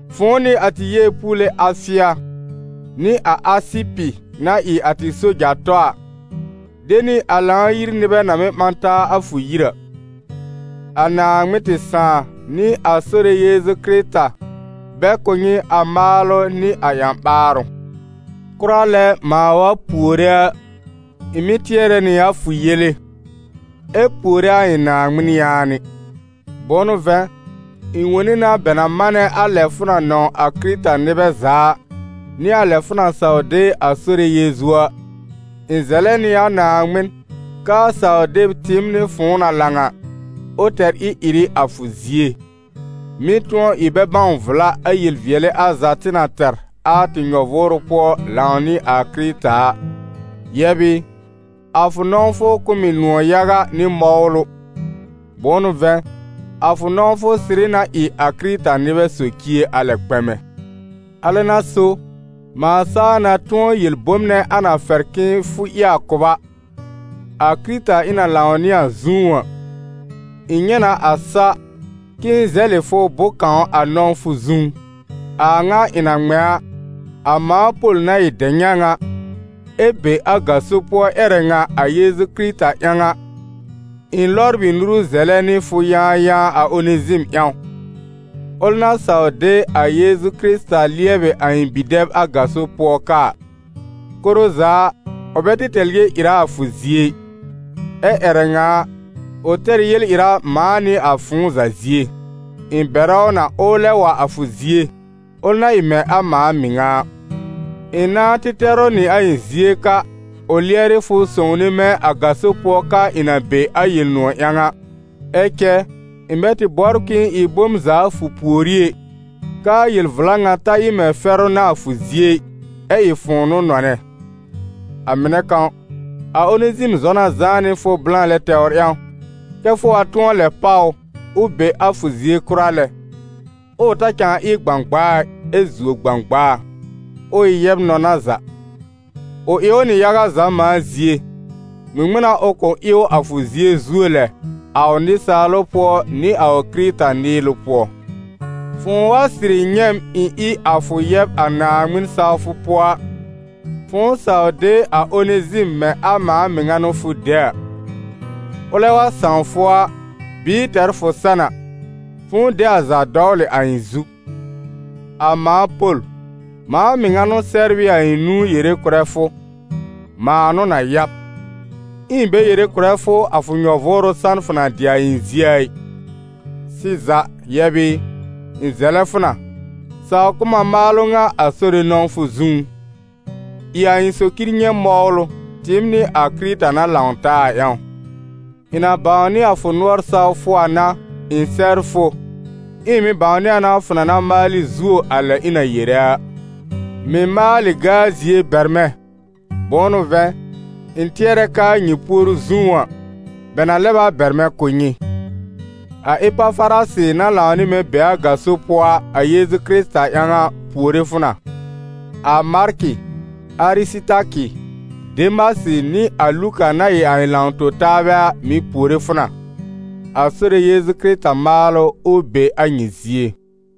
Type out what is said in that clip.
fʋ̃ʋ nɩ a tɩ yeepuule Afɩa, nɩ a Asɩpɩ na ɩ a tɩ soja-tɔ a, de nɩ a Lãw-yir nɩbɛ na mɩ́ ɓã taa a fʋ yir a. A Naaŋmɩn tɩ Sãà nɩ a Sore Yeezu Kɩrɩta, bɛ kʋ̀ nyɩ a maalʋ nɩ a ƴã-ɓaarʋ. Kʋra lɛ mãa wa puore a, ɩ̃ mɩ́ tɩɛrɛ nɩ a fʋ yele, ɛ puore a ɩ̃ Naaŋmɩn yaanɩ. Bʋ̃ʋ n'ʋ vɛ̃, ɩ̃ wone na bɛ na manɛ a lɛ fʋ na nɔ̃w a Kɩrɩta-nɩbɛ za a, nɩ a lɛ fʋ na saw de a Sore Yeezu a. Ɩ̃ zɛlɛ nɩ a Naaŋmɩn k'aa saw-deb tɩɩm nɩ fʋ̃ʋ na lãw a, ʋ tɛr ɩ-ɩrɩ a fʋ zie, mɩ́ tʋ̃ɔ ɩ bɛ bãw vla a yel-vɩɛlɩ al za tɩ na tɛr a tɩ nyɔ-vʋʋrʋ pʋɔ lãw nɩ a Kɩrɩta a. Yɛb ɩ, a fʋ nɔ̃wfʋ kʋ̀ m ɩ nʋ̃ɔ̀ yaga nɩ mɔwlʋ, bʋ̃ʋ n'ʋ vɛ̃, a fʋ nɔ̃wfʋ sɩrɩ na ɩ a Kɩrɩta-nɩbɛ socie a lɛ kpɛmɛ. Alɛ n'a so, mãa saa na tʋ̃ɔ yel bom nɛ a na fɛr kɛ fʋ ɩ a kʋ b a, a Kɩrɩta ɩ̃ na lãw nɩ a zũú a, ɩ̃ nyɛ̃ na a sa, k'ɩ̃ɩ zɛlɩ fʋ bʋ̃-kãw a nɔ̃wfʋ zũú. A a ŋa ɩ̃ na ŋmɛ̃ a, a mãa Pol na ɩ dɛ-nyãw a, ɛ be a gaso pʋɔ ƴɛrɛ ŋa a Yeezu Kɩrɩta ƴãw a, ɩ̃ lɔbr ɩ nuru zɛlɛ nɩ fʋ yãayãa a Onezim ƴãw, ʋl na saw de a Yeezu Kɩrɩta lɩɛbɩ a ɩ̃ bi-dɛb a gaso pʋɔ ka a. Koro za a, ʋ bɛ tɩ tɛr yel-ɩra a fʋ zie ɩ, ɛ ƴɛrɛ ŋa a, ʋ tɛr ɩ yel-ɩra mãa nɩ a fʋ̃ʋ za zie. Ɩ̃ bɛrɛ ʋ na, ʋʋ lɛb wa a fʋ zie, ʋl na ɩ mɛ̃ a mãa mɩŋa a. Ɩ̃ nãá tɩ tɛr ʋ nɩ a ɩ̃ zie ka, ʋ lɩɛrɩ fʋ sõwne mɛ̃ a gaso pʋɔ ka ɩ̃ na be a Yel-nʋ̃ɔ̀ ƴãw a. Ɛ cɛ, ɩ̃ bɛ tɩ bɔbr k'ɩ̃ɩ ɩ bom za a fʋ pùorí ɛ, k'aa yel-vla ŋa ta ɩ mɛ̃ fɛrʋ n'a a fʋ zie ɩ, ɛ ɩ fʋ̃ʋ n'ʋ nɔnɛ. A mɩnɛ kãw, a Onezim zɔ na zãá nɩ fʋ blã lɛ tɛwr ƴãw, kɛ́ fʋ wa tʋ̃ɔ lɛb páw ʋ, ʋ be a fʋ zie kʋra lɛ, ʋʋ ta cãa ɩ gbãgbaa ɩ, ɛ zuo gbãgbaa: ʋ ɩ yɛb-nɔna za. Ʋ ɩ ʋ nɩ yaga za mãa zie, ŋmɩŋmɩn n'a ʋ kʋ̃ ɩ ʋ a fʋ zie zuo lɛ, a ʋ nɩsaalʋ pʋɔ nɩ a ʋ Kɩrɩta-nɩɩlʋ pʋɔ. Fʋ̃ʋ wa sɩrɩ nyɛ̃ m ɩ̃ ɩ a fʋ yɛb a Naaŋmɩn sawfʋ pʋɔ a, fʋ̃ʋ saw de a Onezim mɛ̃ a mãa mɩŋa n'ʋ fʋ de a. Ʋlɛ wa sãw fʋ a, bɩɩ tɛr fʋ san a, fʋ̃ʋ de a za dɔwlɩ a ɩ̃ zu. A mãa Pol, mãa mɩŋa n'ʋ sɛbr ɩ a ɩ̃ nũu yere kʋ̀rɛ fʋ: mãa n'ʋ na ya b. Ɛ ɩ̃ bɛ yere kʋ̀rɛ fʋ a fʋ nyɔ-vʋʋrʋ san fʋ na dɩ a ɩ̃ zie a ɩ. Sɩza, yɛb ɩ, ɩ̃ zɛlɛ fʋ na, saw kʋ̀ m a maalʋ ŋa a Sore nɔ̃wfʋ zũú: ɩ a ɩ̃ socir nyɛ̃ mɔwlʋ, tɩɩm nɩ a Kɩrɩta na lãw taa a ƴãw. Ɩ̃ na bãwnɩ a fʋ nʋɔr sawfʋ a n'a, ɩ̃ sɛbr fʋ, ɛ ɩ̃ mɩ̀ bãwnɩ a na fʋ na na maalɩ zuo a lɛ ɩ̃ na yere a. Mɩ̀ maalɩ gaa-zie bɛr mɛ̃, bʋ̃ʋ n'ʋ vɛ̃, ɩ̃ tɩɛrɛ k'aa nyɩ puoru zũú a, bɛ na lɛb a bɛr mɛ̃ kʋ̀ nyɩ. A Epafarasɩ na lãw nɩ mɛ̃ be a gaso pʋɔ a, a Yeezu Kɩrɩta ƴãw a, puore fʋ na, a Markɩ, Arɩsɩtakɩ, Demasɩ nɩ a Luka, na ɩ a ɩ̃ lãw-tõ-taabɛ a, mɩ̀ puore fʋ na. A Sore Yeezu Kɩrɩta maalʋ, ʋ be a nyɩ zie.